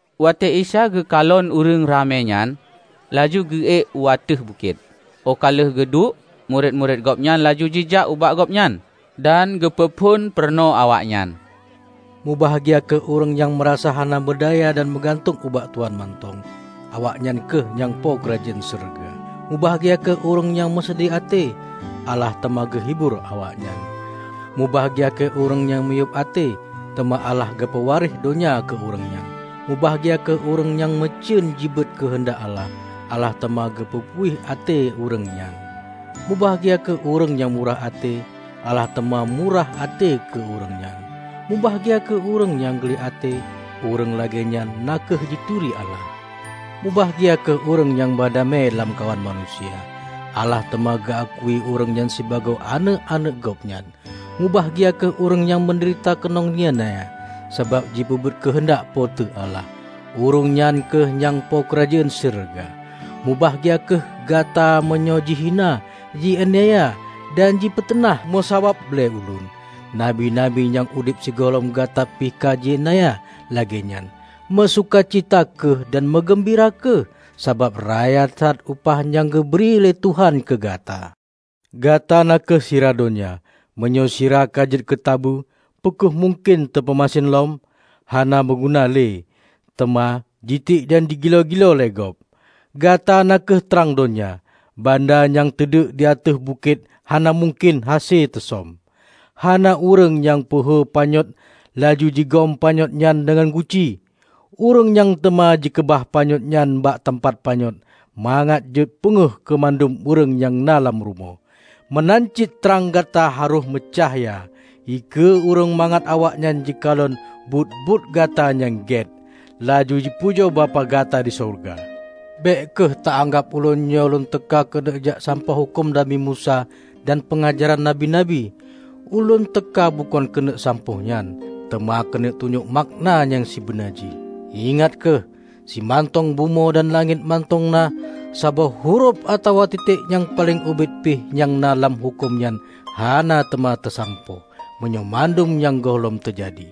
Watée Isa geukalon ureuëng ramé nyan, laju geuék u ateueh bukét. Óh ka lheueh geuduek, murit-murit Gobnyan laju jijak ubak Gobnyan. Dan geupeuphon peurunoe awaknyan: "Mubahgia kheueh ureuëng nyang meurasa hana meudaya dan meugantung ubak Tuhan mantong; awaknyan kheueh nyang po keurajeuen syeuruga. Mubahgia kheueh ureuëng nyang meuseudeh até; Allah teuma geuhibur awaknyan! Mubahgia kheueh ureuëng nyang miyueb até; teuma Allah geupeuwaréh donya keu ureuëng nyan! Mubahgia kheueh ureuëng nyang meucen jipeubuet keuheundak Allah; Allah teuma geupeupuih até ureuëng nyan! Mubahgia kheueh ureuëng nyang murah até; Allah teuma murah até keu ureuëng nyan! Mubahgia kheueh ureuëng nyang gleh até; ureuëng lagée nyan na kheueh jituri Allah. Mubahgia kheueh ureuëng nyang ba damé lamkawan manusia; Allah teuma geu akui ureuëng nyan sibagoe aneuëk-aneuëk Gobnyan! Mubahgia kheueh ureuëng nyang meudeurita keunong iénanya sabab jipeubuet keuheundak Po teu Allah; ureuëng nyan kheueh nyang po keurajeuen syeuruga! Mubahgia kheueh gata meunyoe jihina, ji-iénanya, dan jipiteunah meusabab lé Ulôn. Nabi-nabi nyang udeb sigohlom gata pih ka ji-iénanya lagée nyan. Meusuka cita kheueh dan meugeumbira kheueh, sabab raya that upah nyang geubri lé Tuhan keu gata." "Gata na kheueh sira donya. Meunyoe sira ka jeuet keu tabeue, peu kheueh mungken teupeumasen lom? Hana meunguna lé, teuma jitiek dan jigiloe-giloe lé gob. Gata na kheueh trang donya. Banda nyang teuduek di ateueh bukét hana mungken hase teusöm. Hana ureuëng nyang peuhu panyöt, laju jigom panyöt nyan deungon guci. Ureuëng nyan teuma jikeubah panyöt nyan bak teumpat panyöt, mangat jeuet peungéh keu mandum ureuëng nyang na lam rumoh. Meunan cit trang gata harôh meucahya dikeue ureuëng, mangat awaknyan jikalon buet-buet gata nyang gét, laju ji pujoe Bapak gata di syeuruga." "Bék kheueh ta anggab Ulôn nyoe Lôn teuka keuneuk jak sampôh huköm Nabi Musa dan peungajaran nabi-nabi. Ulôn teuka bukon keuneuk sampôh nyan, teuma keuneuk tunyok makna nyang sibeuna jih. Ingat kheueh! Simantong bumoe dan langét mantong na, saboh hurof atawa titek nyang paleng ubit pih nyang na lam huköm nyan, hana teuma teusampôh, meunyoe mandum nyan gohlom teujadi!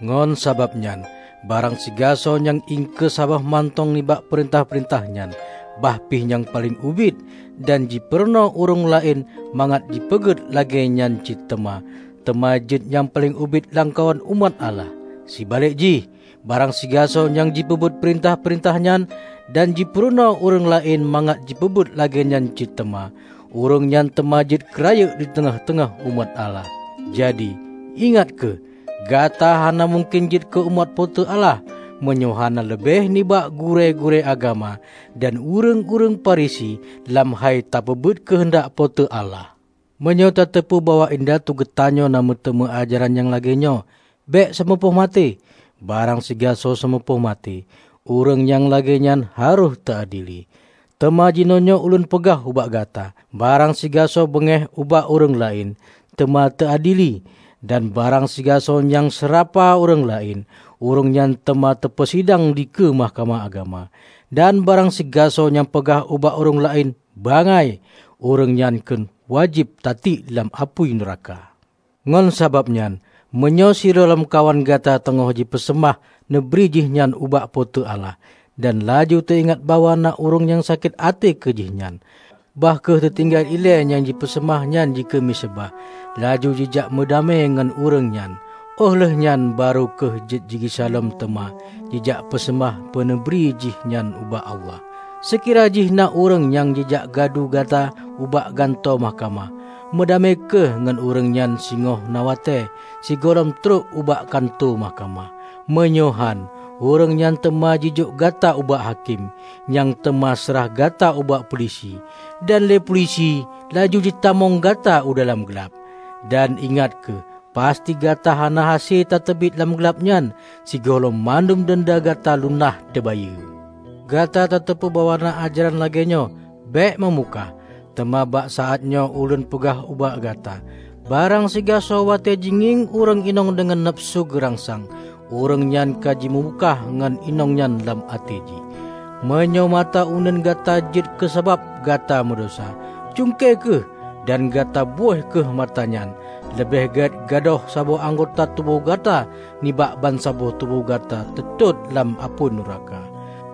Ngon sabab nyan, barang sigasoe nyang iengkeue saboh mantong nibak peurintah-peurintah nyan, bahpih nyang paleng ubit, dan jipeurunoe ureuëng laén mangat jipeugét lagée nyan cit teuma, teuma jeuet nyang paleng ubit lamkawan umat Allah. Seubalek jih, barang sigasoe nyang jipeubuet peurintah-peurintah nyan dan jipurunoe ureuëng laén mangat jipeubuet lagée nyan cit teuma, ureuëng nyan teuma jeuet keu rayeuk di teungoh-teungoh umat Allah. Jadi, ingat kheueh: Gata hana mungken jeuet keu umat Po teu Allah, meunyoe hana leubeh nibak gurée-gurée agama dan ureuëng-ureuëng Farisi lam hai tapeubuet keuheundak Po teu Allah!" "Meunyoe tateupeue bahwa indatu geutanyoe na meuteumé ajaran nyang lagée nyoe: Bék seumeupoh maté; barang sigasoe seumupoh maté, ureuëng nyang lagée nyan harôh teuadili. Teuma jinoenyoe Ulôn peugah ubak gata, barang sigasoe beungéh ubak ureuëng laén, teuma teuadili; dan barang sigasoe nyang seurapa ureuëng laén, ureuëng nyan teuma teupeusidang dikeue Mahkamah Agama. Dan barang sigasoe nyang peugah ubak ureuëng laén, 'Bangai,' ureuëng nyang kheun wajéb teutiek lam apui nuraka. Ngon sabab nyan, meunyoe sidroe lamkawan gata teungoh jipeuseumah meuneubri jihnyan ubak Po teu Allah, dan laju teu-ingat bahwa na ureuëng nyang sakét até keu jihnyan, bah kheueh teutinggai ilée nyang jipeuseumah nyan dikeue miseubah, laju jijak meudamé ngon ureuëng nyan. Óh lheueh nyan, barô kheueh jeuet jigisa lom teuma jijak peuseumah meuneubri jih nyan ubak Allah. Seukira jih na ureuëng nyang jijak gadu gata ubak gantoe mahkamah, meudamé kheueh ngon ureuëng nyan singoh na watée sigohlom trok ubak kantô mahkamah. Meunyoe hán, ureuëng nyan teuma jijok gata ubak hakém, nyang teuma seurah gata ubak peulisi, dan lé peulisi laju jipeutamong gata u dalam glab. Dan ingat kheueh: Pasti gata hana hase tateubiet lam glab nyan, sigohlom mandum denda gata lunaih teubayeue." "Gata tateupeue bahwa na ajaran lagée nyoe: Bék meumukah. Teuma bak saát nyoe Ulôn peugah ubak gata: Barang sigasoe watée jigieng ureuëng inong deungon nafeusu gurangsang, ureuëng nyan ka jimeumukah ngon inong nyan lam até jih. Meunyoe mata uneuen gata jeuet keu sabab gata meudesya, cungke kheueh dan gata böih kheueh mata nyan! Leubeh gét gadôh saboh anggota tuboh gata nibak bansaboh tuboh gata teutot lam apui nuraka.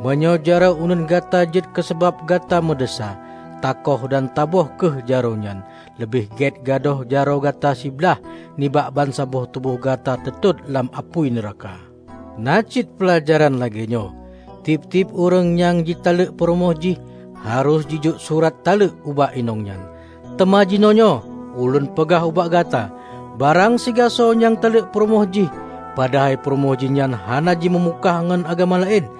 Meunyoe jaroe uneuen gata jeuet keu sabab gata meudesya, taköh dan taböih kheueh jaroe nyan! Leubeh gét gadôh jaroe gata sibalih nibak bansaboh tuboh gata teutot lam apui nuraka." "Na cit peulajaran lagée nyoe: tieb-tieb ureuëng nyang jitaleuek peurumoh jih, harôh jijok surat taleuek ubak inong nyan. Teuma jinoenyoe Ulôn peugah ubak gata: barang sigasoe nyang taleuek peurumoh jih padahai peurumoh jih nyan hana jimeumukah ngon agam laén,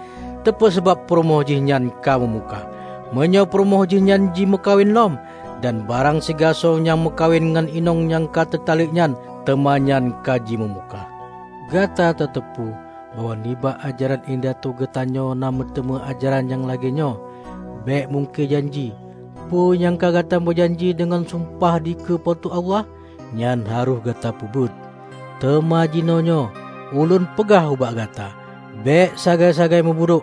teupeusabab peurumoh jih nyan ka meumukah, meunyoe peurumoh jih nyan jimeukawen lom. Dan barang sigasoe nyang meukawen ngon inong nyang ka teutaleuek nyan, teuma nyan ka jimeumukah." "Gata tateupeue bahwa nibak ajaran indatu geutanyoe na meuteumé ajaran nyang lagée nyoe: bék mungkie janji. Peue nyang ka gata meujanji deungon sumpah dikeue Po teu Allah, nyan harôh gata peubuet. Teuma jinoenyoe Ulôn peugah ubak gata: bék sagai-sagai mubudok,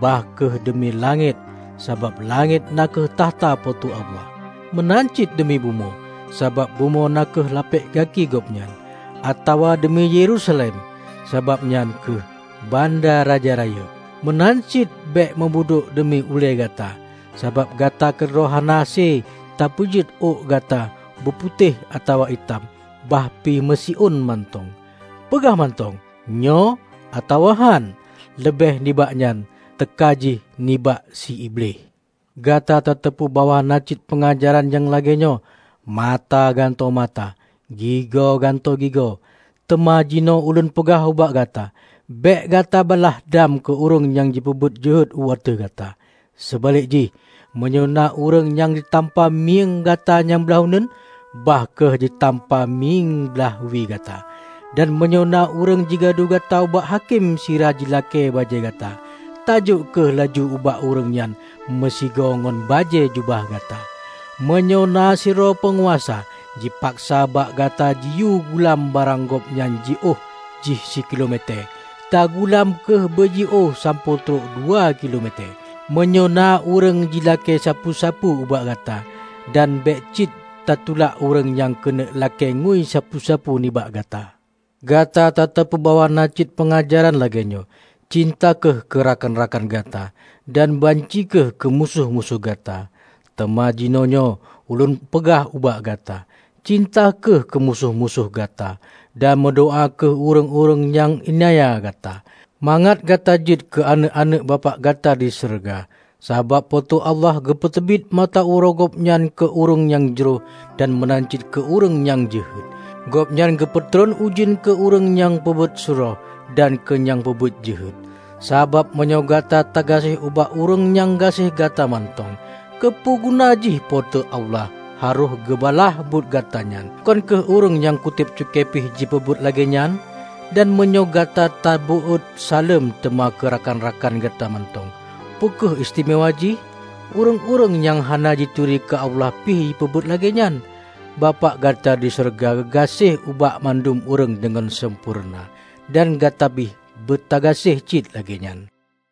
bah kheueh deumi langét, sabab langét na kheueh takhta Po teu Allah, meunan cit deumi bumoe, sabab bumoe na kheueh lapek gaki Gobnyan: atawa deumi Yerusalem, sabab nyan kheueh banda Raja rayeuk. Meunan cit bék meubudok deumi ulée gata, sabab gata keudroe hana hase tapeujeuet ôk gata buputéh atawa itam, bahpih meusiôn mantong. Peugah mantong, 'Nyoe' atawa 'Hán' -- leubeh nibak nyan teuka jih nibak si Iblih." "Gata tateupeue bahwa na cit peungajaran nyang lagée nyoe: mata gantoe mata, gigo gantoe gigo. Teuma jinoe Ulôn peugah ubak gata: bék gata balaih dam keu ureuëng nyang jipeubuet jeuhet u ateueh gata. Seubalek jih, meunyoe na ureuëng jitampa mieng gata nyang blaih uneuen, bah kheueh jitampa mieng blaih wie gata. Dan meunyoe na ureuëng jigadu gata ubak hakém sira jilakée bajée gata, taujok kheueh laju ubak ureuëng nyan meusigoe ngon bajée jubah gata. Meunyoe na sidroe peunguasa jipaksa bak gata jiyue gulam barang gob nyang jiôh jih sikilo metée, tagulam kheueh beujiôh sampoe trok dua kilo metée. Meunyoe na ureuëng jilakée sapeue-sapeue ubak gata. Dan bék cit tatulak ureuëng nyang keuneuk lakée ngui sapeue-sapeue nibak gata." "Gata tateupeue bahwa na cit peungajaran lagée nyoe: cinta kheueh keu rakan-rakan gata dan banci kheueh keu musoh-musoh gata. Taeuma jinoenyoe Ulôn peugah ubak gata: cinta kheueh musoh-musoh gata, dan meudoá kheueh ureuëng-ureuëng nyang iénanya gata, mangat gata jeuet keu aneuëk-aneuëk Bapak gata di syeuruga. Sabab Po teu Allah geupeuteubiet mata uroe Gobnyan keu ureuëng nyang jroh dan meunan cit keu ureuëng nyang jeuhet. Gobnyan geupeutron ujeuen keu ureuëng nyang peubuet surôh dan keu nyang peubuet jeuhet. Sabab meunyoe gata tagaséh ubak ureuëng nyang gaséh gata mantong, keupeue guna jih Po teu Allah harôh geubalaih buet gata nyan? Bukon kheueh ureuëng nyang kutéb cukée pih jipeubuet lagée nyan? Dan meunyoe gata tabeuôt saleuem teuma keu rakan-rakan gata mantong, peu kheueh istimewa jih? Ureuëng-ureuëng nyang hana jituri keu Allah pih jipeubuet lagée nyan! Bapak gata di syeuruga geugaséh ubak bandum ureuëng deungon sampoereuna. Dan gata pih beutagaséh cit lagée nyan."